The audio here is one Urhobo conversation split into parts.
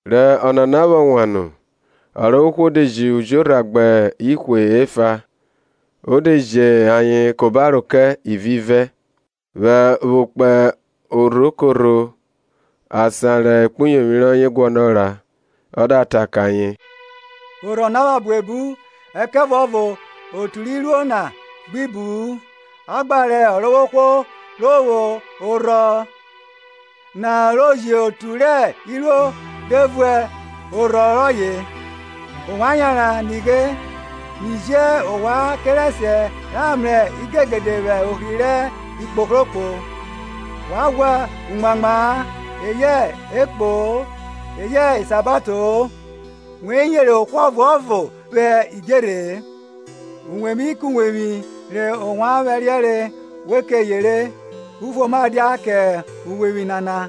Rẹ Ọnana vwọ wan nu Ọrovwohwo de ji ujorha gbẹ ihwe efa, o de ji ayen ka obaro kẹ, ivivẹ, vwo kpo orho korho asan rẹ okpuyovwi rọye guọnọ ra. Ọ da ta kẹ ayen, orhọ na pha buebu, ẹkẹvuọvo otu rẹ iruo na gbi bu-n; a gba rẹ Ọrovwohwo ro vwo orhọ na ro ji otu rẹ iruo re vun orhọ rọye. Ovwan yanran; nighe, mi ji ovwan kerẹsiẹ ra mrẹ igegede vwẹ ohri rẹ ikpohrokpo. Wa ghwa umuamwa-a, eyẹ ekpo-o, eyẹ isabato-o, we yere ohwo ọvuọvo vwẹ idjerhe-e. Uwevwi kuwevwi re ovwan vwẹriẹre, we ke yere, Ufuoma dia kẹ uwevwi nana!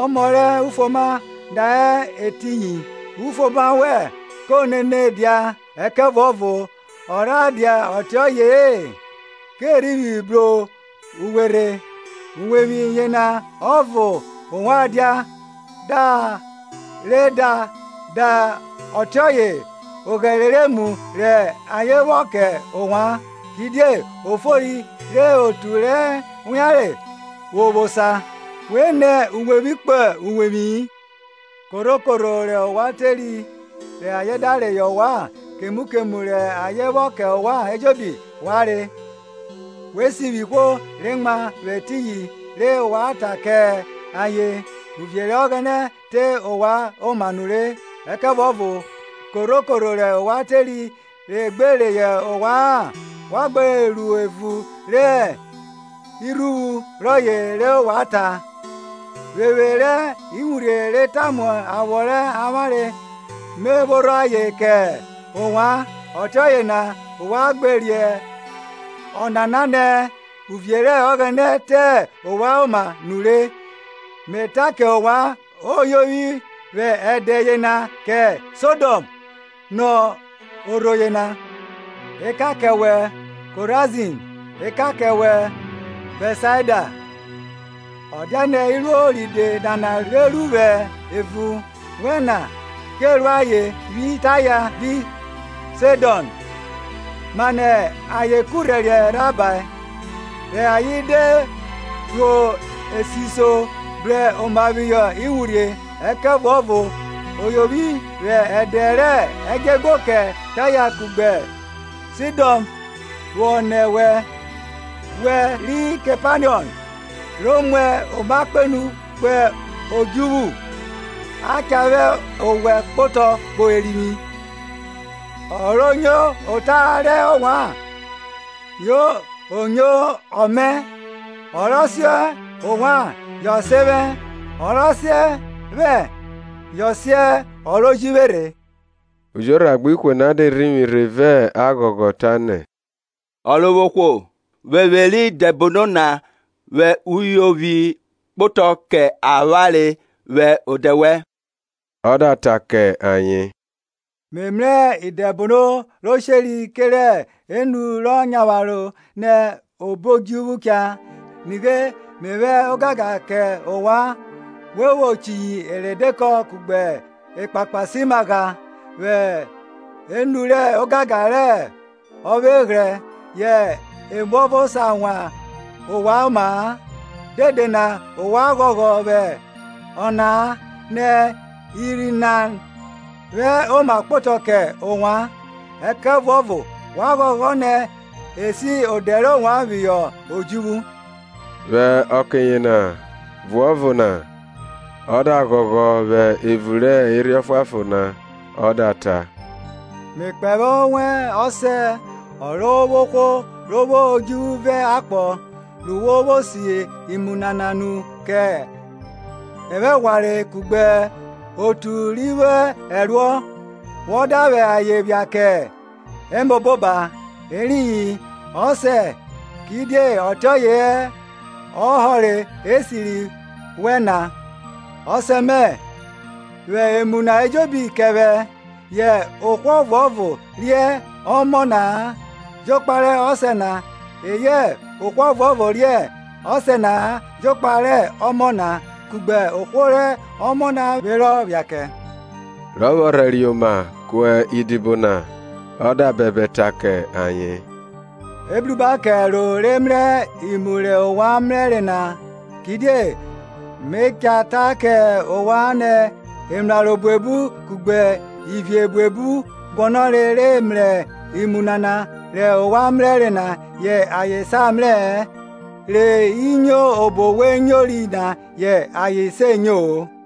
Ọmọ rẹ ufuoma da hẹ etiyin, ufuoma wẹn ko nene dia; ẹkẹvuọvo ọ rha dia ọtiọye-e, ko rhivwi bru uwe rhe. Uwevwi yena ọvo ovwan dia, da re da da ọtiẹ oghẹre rẹ emu rẹ ayen vwọ kẹ ovwan, kidie ofori re otu re wianre vwo vwo osa; We nẹ uwevwi kpo uwevwi-i. Korho korho rẹ ovwan teri rẹ ayen da reyọ ovwan, kemu kemu rẹ ayen vwọ kẹ ovwan ejobi wa re; we sivwi ihwo re mwa vwẹ etiyin re wa ta kẹ ayen, Uvie rẹ Ọghẹnẹ te ovwan oma nure. Ẹkẹvuọvo korho korho rẹ ovwan teri rọ gbe reyọ ovwa-an wa gba ro evun rẹ irhuvwu rọye re wa ta, Vwevwe rẹ iwurhie re tamu awọ rẹ avwanre, me phorho ayen kẹ ovwan; ọtiọye na ovwan gba riẹn ọnana nẹ, uvie rẹ Ọghẹnẹ te ovwan oma nure. Me ta kẹ ovwan, Oyovwi vwẹ ẹdẹ yena kẹ Sodọm nọ orho yena. Ekan kẹ wẹ, Korazin! ekan kẹ wẹ, Bẹtsaidai Ọ dianẹ iruo ride nana re ru vwẹ evun wẹ na ke ru ayen vwi Taya vi Saidọn, manẹ ayen kurhẹriẹ rhabae, rẹ ayen de rhuo esiso bru oma phihọ iwurhie. Ẹkẹvuọvo o yovwi vwẹ ẹdẹ rẹ ẹdjọeguo kẹ Taya kugbe Saidọn vwo nọ wẹ. Wẹ, ri Kepanọm, ro muẹ oma kpenu kpo odjuvwu? A cha vwẹ owẹ kpotọ kpo Erivwi. Ọ ro nyo ota rẹ ovwan yo nyo ọ mẹ, ọ rọ sen ovwan yọ sen vwẹ, ọ rọ sen vwẹ yọ sen ọ ro ji vwe rhe. Ujorha gbẹ ihwe na de rhivwi rhe vẹ aghọghọ, tanẹ, Ọrovwohwo, Vwevwe rẹ idẹbono na vwẹ uyovwi kpotọ kẹ avwanre vwẹ odẹ wẹn! Ọ da ta kẹ ayen, Me mrẹ Idẹbono ro sheri kerẹ enu rọ nyavwaro nẹ obo odjuvwu cha. Nighe, Me vwẹ ogangan kẹ ovwan we vwo chiyi eredekọ kugbe ekpakpasimagha, vwẹ enu rẹ ogangan rẹ ọvweghrẹ; yẹ emuọvo sa wan ovwan oma-a. Dede na ovwan ghọghọ vwẹ ọna-a, nẹ irhi na vwẹ oma kpotọ kẹ ovwan; ẹkẹvuọvo wa ghọghọ nẹ e si odẹ rẹ ovwan phihọ odjuvwu. Vwẹ ọke yena vuọvo na ọ da ghọghọ vwẹ evun rẹ Erhi Ọfuanfon na ọ da ta, Me kpẹvwẹ owẹn, Ọsẹ, Ọrovwohwo ro vwo odjuvwu vẹ akpọ, ru wo vwo si imu nana nu kẹ evwaghwanre kugbe otu ri vwo ẹruọ wọ da vwẹ ayen phia kẹ emọboba; eriyin, Ọsẹ, kidie ọtiọye hẹ ọhọre esiri wẹn na. Ọsẹ mẹ vwẹ emu na ejobi kẹ vwẹ; yẹ ohwo ọvuọvo riẹn ọmọ na-a jokpa rẹ Ọsẹ na, eyẹ ohwo ọvuọvo riẹn Ọsẹ na-a jokpa rẹ ọmọ na kugbe ohwo rẹ ọmọ na vwe rọ phia kẹ. Rọ vwọ rhẹriẹ oma ku idibo na ọ da bẹbẹ ta kẹ ayen, Ebruba kẹ ẹro re mrẹ imu rẹ ovwan mrẹre na! Kidie Me ta kẹ ovwan nẹ emraro buebu kugbe ivie buebu guọnọre re mrẹ imu nana rẹ ovwan mrẹre na, yẹ ayen sa mrẹ-ẹ, re i nyo obo we nyori na, yẹ ayen se nyo-o.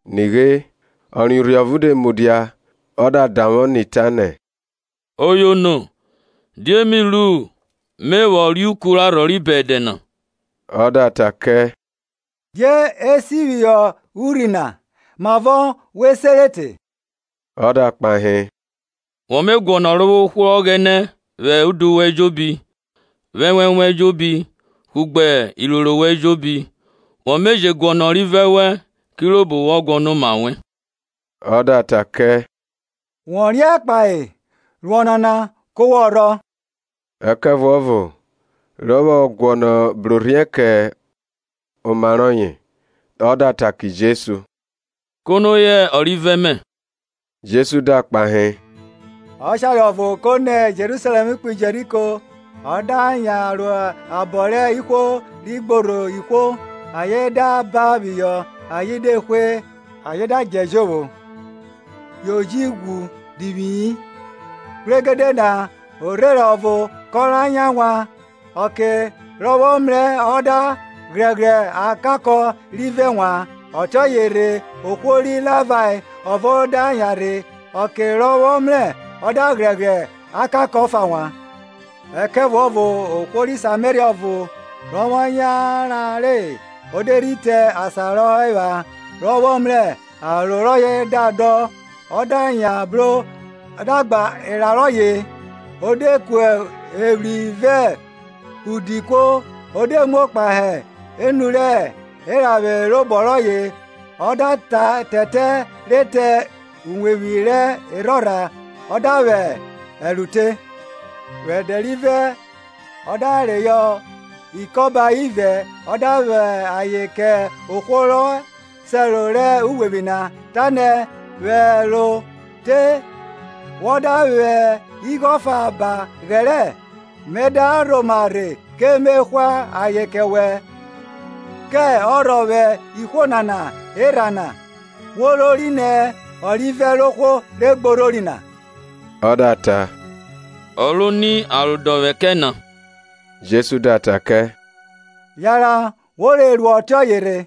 Nighe, ọ riẹn urhi ọvo de mudia ọ da davwọ ni, tanẹ, Oyono, die mi ru me vwọ reuku rẹ arhọ ri bẹdẹ na? Ọ da ta kẹ, Die e si phihọ urhi na? Mavọ wo sere te? Ọ da kpahe, Wọ me guọnọ Ọrovwohwo Ọghẹnẹ vwẹ udu wẹn ejobi, vwẹ ẹnwẹn wẹn ejobi, kugbe iroro wẹn ejobi, wọ me je guọnọ ọrivẹ wẹn kirobo wọ guọnọ oma wẹn. Ọ da ta kẹ, Wọ riẹn kpahe, ru ọnana, ku wọ rhọ. Ẹkẹvuọvo, rọ vwọ guọnọ brorhiẹ kẹ oma rọye, ọ da ta kẹ Jesu, Kono hẹ ọrivẹ mẹ? Jesu da kpahe, Ọshare ọvo ko nẹ Jerusalẹm kpo Jeriko, ọ da yan ro abọ rẹ ihwo ri gborho ihwo, ayen da ban phihọ ayen de hwe, ayen da djẹ jovwo yo ji ghwu divwi-i. Kpregede na orherẹn ọvo kọ ra yan vwa; ọke rọ vwọ mrẹ ọ da ghrẹghrẹ akakọ rivẹ wan. Ọtiọye rhe ohwo ri Livae ọvo da yanrhe, ọke rọ vwọ mrẹ ọ da ghrẹghrẹ akakọ ọfa wan. Ẹkẹvuọvo ohwo ri Sameria ọvo, rọ vwọ yanran re, o de rhi te asan rọ hẹ epha, rọ vwọ mrẹ, aro rọye da dọn, ọ da yan bro ọ da gba era rọye, o de ku evwri vẹ udi kuo; o de muo kpahe enu rẹ eranvwe robọ rọye, o da tẹtẹ re te uwevwi rẹ erhorha, ọ da vwẹ ẹro te. Vwẹ ẹdẹ rivẹ ọ da reyọ ikọba ivẹ ọ da vwẹ ayen kẹ ohwo rọ sẹro rẹ uwevwi na, tanẹ, Vwẹ ẹro te; vwọ da vwẹ igho ọfa ba ghẹrẹ, mẹ da rhoma rhe ke me hwa ayen kẹ wẹ. Kẹ ọrhọ vwẹ ihwo nana erha na, wo rori nẹ, ọrivẹ rẹ ohwo re gborhori na? Ọ da ta, Ọ ro ni arodọvwẹ kẹ na. Jesu da ta kẹ, yanran wo re ru ọtiọye rhe.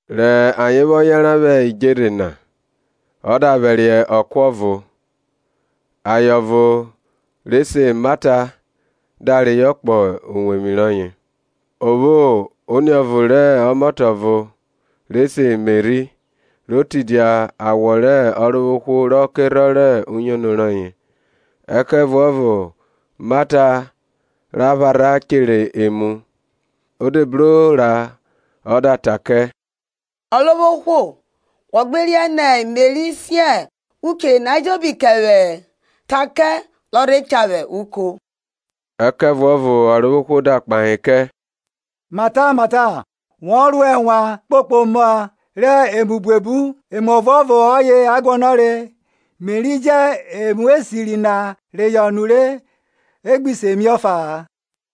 Rẹ ayen vwọ yanran vwẹ idjerhe na, ọ da vwẹriẹ ọko ọvo; aye ọvo re se Mata da reyọ kpọ uwevwi rọye. O vwo oniọvo rẹ ọmọtẹ ọvo re se Meri, ro tidia awọ rẹ Ọrovwohwo rọ kerhọn rẹ uyono rọye. Ẹkẹvuọvo Mata ra pharha chere emu, ọ de bro ra ọ da ta kẹ, Ọrovwohwo, wo gbe riẹn nẹ Meri sen uchere na ejobi kẹ vwẹ-ẹ? Ta kẹ rọ rhe cha vwẹ uko. Ẹkẹvuọvo Ọrovwohwo da kpahe kẹ, Mata, Mata, wọ ro ẹnwan kpokpo oma rẹ emu buebu; emu ọvo ọye a guọnọre. Meri jẹ emu esiri na reyọ nure, e gbi se mie ọfa-a.